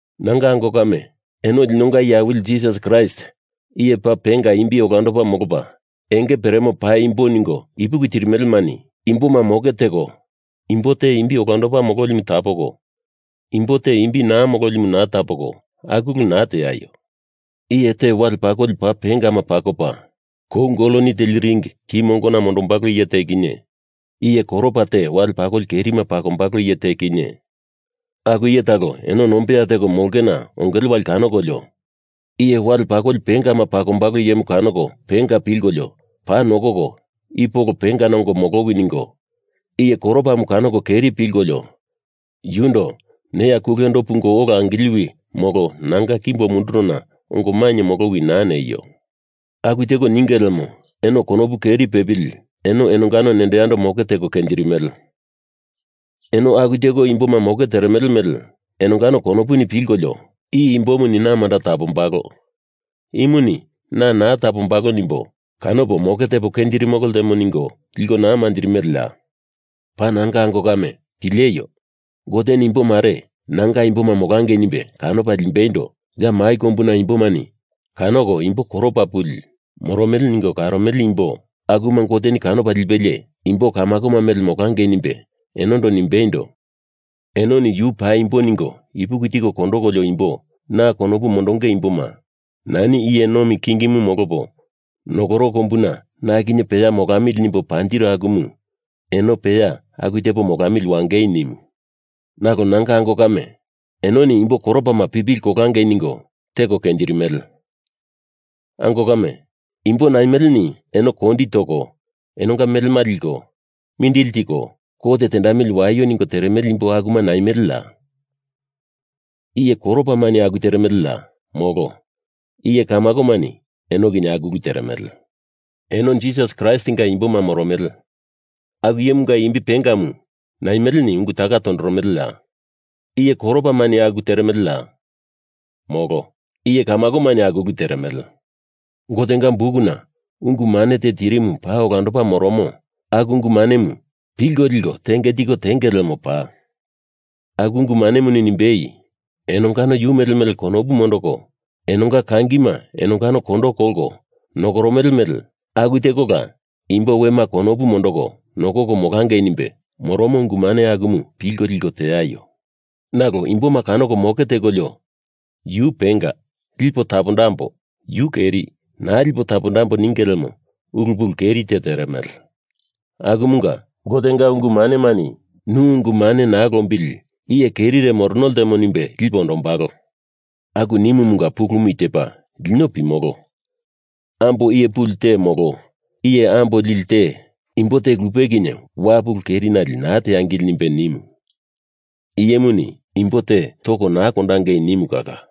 Nanga ango kame, eno linonga iye awili Jisas Kraist iye paa penga imbi olandopa molopa enge peremo paimbo ningo ipuki tirimelemani imboma moke teko imbo te imbi olando mololimu tapoko, imbo te imbi naa mololimu naa tapoko, aku ulu naa teaio. Iye te wale pakoli paa pengama pakopa, kou goloni teli ring ki mongona mondombalo iye te kinye, iye koropa te wale pakoli kerima pakombalo iye te kinye, aku iye talo eno nombeya teko molongena ongele wali kanokolio iye wale pakoli pengama pakombalo iyemu kanoko penga pilkolio paa nokoko i polo pengana ongo molowi ningo, iye koropamu kanoko keri pilkolio yundo neya kulendo pungo ola angiliwi molo nanga kimbo mundurona ongo mainye molowi naa neio. Aku teko ninge lemo eno konopu keri pepili eno enongano nendo yando moke teko kenjirimele. Eno aku teko imboma moke teremele mele enongano konopuni pilkolio i imbomuni na manda tapombalo, imuni na naa tapombalo nimbo kanopo moke tepo kenjirimolo ltemo ningo liko naa manjirimeleya? Paa nanga ango kame, pileio! Goteni imbo mare nanga imboma molangei nimbe kanopa limbeindo ya mai kombuna imbomani kanoko imbo koropa pupili moromele ningo karomele imbo akuma Goteni kanopa lipelie imbo kamako mele molangei nimbe enondo nimbeindo, enoni yu paimbo ningo ipuki tiko kondokolio imbo na konopu mondonge imboma nani iye nomi kingimu molopo nokoro kombuna na kinye peya molamili nimbo panjiru akumu eno peya aku tepo molamili wangei nimu. Nalo nanga ango kame, enoni imbo koropama pipili kolangei ningo teko kenjirimele. Ango kame, imbo naimeleni eno kondi toko enonga melema liko, mindili tiko, kot tendamili waio ningo teremele imbo akuma naimeleya? Iye koropamani aku teremeleya? Molo! Iye kamakomani eno kinye aku ulu teremele. Eno Jisas Kraistinga imboma moromele aku iyemunga imbi pengamu naimeleni ungu taka tondoromeleya? Iye koropamani aku teremeleya? Molo! Iye kamakomani aku ulu teremele. Gotenga bukuna ungu mane te tirimu paa olandopa moromo aku ungu manemu pilko liko tenge tiko tenge lemo paa. Aku ungu manemuni nimbei, enongano yu mele mele konopu mondoko, enonga kangima enongano kondo kolko nokoromele mele aku tekola imbo wema konopu mondoko nokoko molangei nimbe moromo ungu mane akumu pilko liko teaio. Nalo imboma kanoko moke tekolio yu penga, lipo tapondambo; yu keri, naa lipo tapondambo ninge lemo ulu pulu keri te teremele. Akumunga Gotenga ungu manemani nu ungu mane naa lombili iye kerire morono ltemo nimbe lipe ondombalo. Aku niomunga pulumu i tepa: Lino pimolo, ambo iye puli te molo iye ambo lili te imbo te lupe kinye wapu ulu kerinali naa teangili nimbe nimu Iyemuni imbo te toko naa kondangei nimu kala.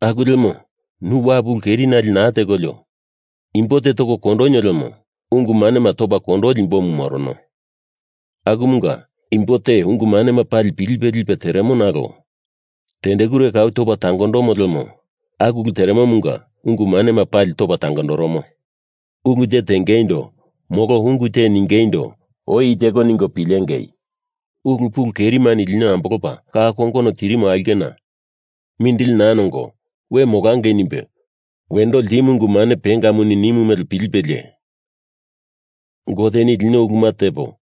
Aku lemo nu wapu ulu kerinali naa tekolio imbo te toko kondonio lemo ungu manema topa tangondoli imbomu morono. Akumunga imbo te ungu manema pali pilipe lipe teremo nalo tendekure kau topa tangondomo lemo aku ulu teremomunga ungu manema pali topa tangondoromo. Ulu te tengeindo molo ungu te ningeindo oi i teko ningo pilengei. Ulu pulu kerimani lino ambolopa ka kongono tirimo aulkena mindili naa nongo we molangei nimbe wendo ltimu ungu mane pengamuni nimo mele pilipelie Goteni lino uluma tepo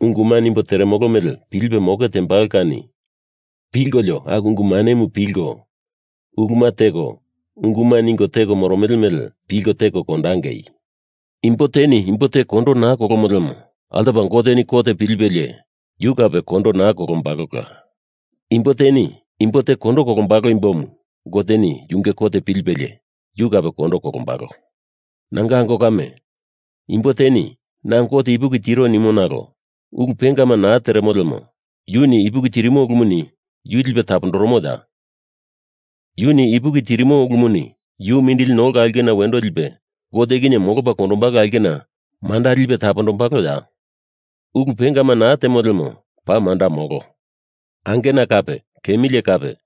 unguma nimbo teremolo mele pilipe moke tembalo kani, pilkolio aku ungu manemu pilko uluma teko unguma ningo teko moromele mele pilko teko kondangei. Imbo teni imbo te kondo naa kolomo lemo altopa Goteni kot pilipelie yu kape kondo naa kolombalola. Imbo teni imbo te kondo kolombalo imbomu Goteni yunge kot pilipelie yu kape kondo kolombalo. Nanga ango kame, imbo teni na Gote ipuki tiro nimo nalo ulu pengama na teremo lemo yuni ipuki tirimo ulumuni yu lipe tapondoromoya? Yuni ipuki tirimo ulumuni yu mindili nolka aulkena wendo lipe Gote kinye molopa kondombalo aulkena manda lipe mondombaloya? Ulu pengama naa temo lemo paa manda molo. Angena kape kemilie kape,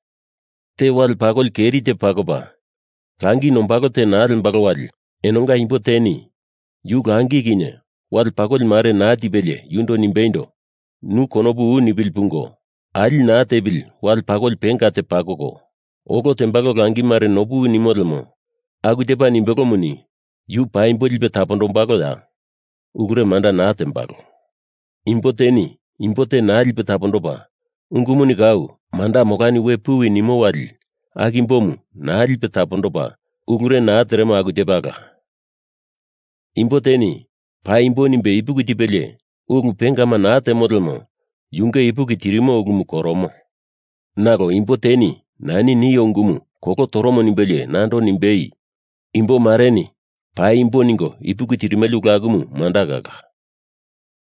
te wale pakoli keri te pakopa, langi nombalo te naa lembalo wali, enonga imbo teni yu langi kinye wale pakoli mare naa tipelie yundo nimbeindo, nu konopu u nipili pungo, ali naa tepili wale pakoli penga te pakoko, olo tembalo langi mare nopuwi nimo lemo aku tepa nimbelomuni yu paimbo lipe tapondombaloya? Ulure manda naa tembalo. Imbo teni imbo te naa lipe tapondopa ungumuni kau manda molani puwi we nimo wali aku imbomu naa lipe tapondopa ulure naa teremo aku tepala. Imbo teni paimbo nimbe ipuki tipelie ulu pengama naa temo lemo yunge ipuki tirimo ulumu koromo. Nalo imbo teni nani i nio ungumu kolo toromo nimbelie nando nimbei, “Imbo mareni paimbo ningo ipuki tirimele ulu akumu manda kala.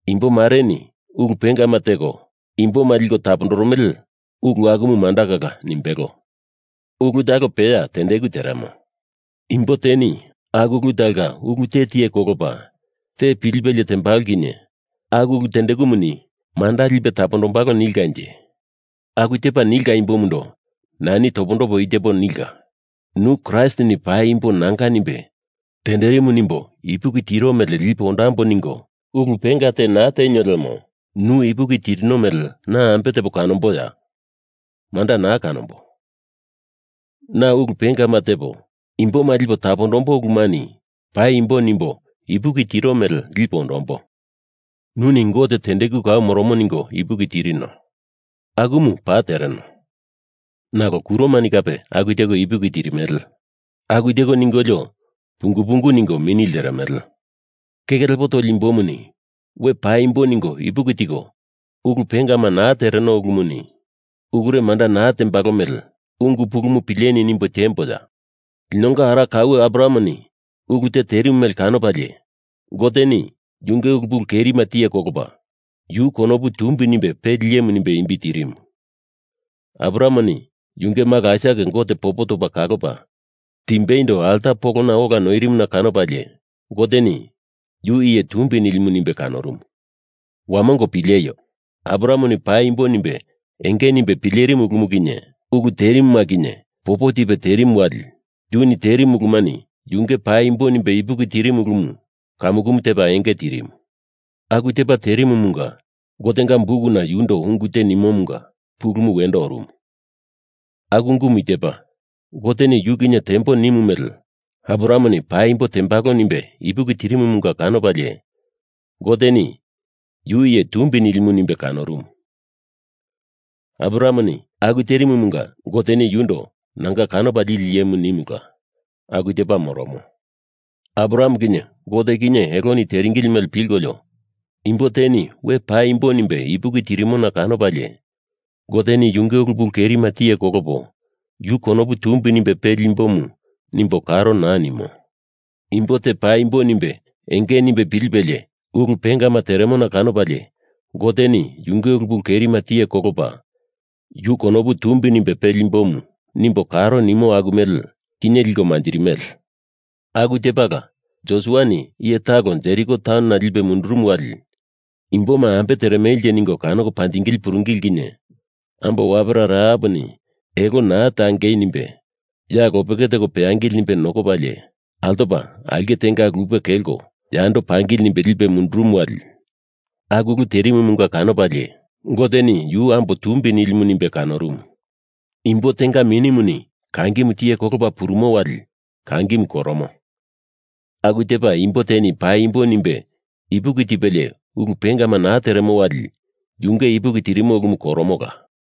Imbo mareni ulu pengama teko imboma liko tapondoromele ulu akumu manda kala,” nimbelo. Ulu talo peya tendeku teremo. Imbo teni aku ulu talonga ulu te tiye kolopa te pilipelie tembalo kinye aku ulu tendekumuni manda lipe tapondombalo nilkanje. Aku tepa nilka imbomundo nani topondopo i tepo nilka: nu Kraistini paimbo nanga nimbe tenderimu nimbo ipuki tiro mele lipo ondambo ningo ulu penga te naa tenio lemo nu ipuki tirino mele na ambe tepo kanomboya? Manda naa kanombo. Na ulu pengama tepo imboma lipo tapondombo ulumani paimbo nimbo ipuki tiro mele lipo ondombo. Nuni Gote tendeku kau moromo ningo ipuki tirino. Akumu paa tereno. Nalo kuromani kape aku teko ipuki tirimele. Aku teko ningolio pungu pungu ningo mini lteremele. Keke lepo toli imbomu, we paimbo ningo ipuki tiko ulu pengama naa tereno ulumuni ulure manda naa tembalo mele ungu pulumu pileni nimbo tiemboya? Linonga ara kaue Abrahameni ulu te terimu mele kanopalie Goteni yunge ulu pulu kerima tiye kolopa, yu konopu tumbi nimbe peli iyemu nimbe imbi tirimu. Abrahameni yunge malo Aisak Gote popo topa kalopa timbeindo alta polona ola noirimuna kanopalie Goteni yu iye tumbi nilimu nimbe kanorumu. Wamongo pileio! Abrahameni paimbo nimbe enge nimbe pilerimu ulumu kinye ulu terimuma kinye popo tipe terimu wali yuni terimu ulumani yunge paimbo nimbe ipuki tirimu ulumu kamukumu tepa enge tirimu. Aku tepa terimumunga Gotenga bukuna yundo ungu te nimomunga pulumu wendo orumu. Aku ungumu i tepa: Goteni yu kinye tembo nimu mele Abrahameni paimbo tembalo nimbe ipuki tirimumunga kanopalie Goteni yu iye tumbi nilimu nimbe kanorumu. Abrahameni aku terimumunga Goteni yundo nanga kanopa lili iyemu nimula aku tepa moromo. Abraham kinye Gote kinye eloni teringili mele pilkolio, imbo teni we paimbo nimbe ipuki tirimona kanopalie Goteni yunge ulu pulu kerima tiye kolopo, yu konopu tumbi nimbe peli imbomu nimbo karo naa nimo. Imbo te paimbo nimbe enge nimbe pilipelie ulu pengama teremona kanopalie Goteni yunge ulu pulu kerima tiye kolopo, yu konopu tumbi nimbe peli imbomu nimbo karo nimo aku mele kinye liko manjirimele. Aku tepala, Josuani iye talo Jeriko taunona lipe mundurumu wali imboma ambe teremelenje ningo kanoko panjingili puringili kinye ambo wapera Rahaponi elo naa tangei nimbe ya lopeke teko peangili nimbe nokopalie, altopa aulke tenga lupe kelko yando pangili nimbe lipe mundurumu wali aku ulu terimumunga kanopalie Goteni yu ambo tumbi nilimu nimbe kanorumu. Imbo tenga minimuni kangimu tiye kolopa purumo wali kangimu koromo, aku tepa imbo teni paimbo nimbe ipuki tipelie ulu pengama naa teremo wali yunge ipuki tirimo ulumu koromola.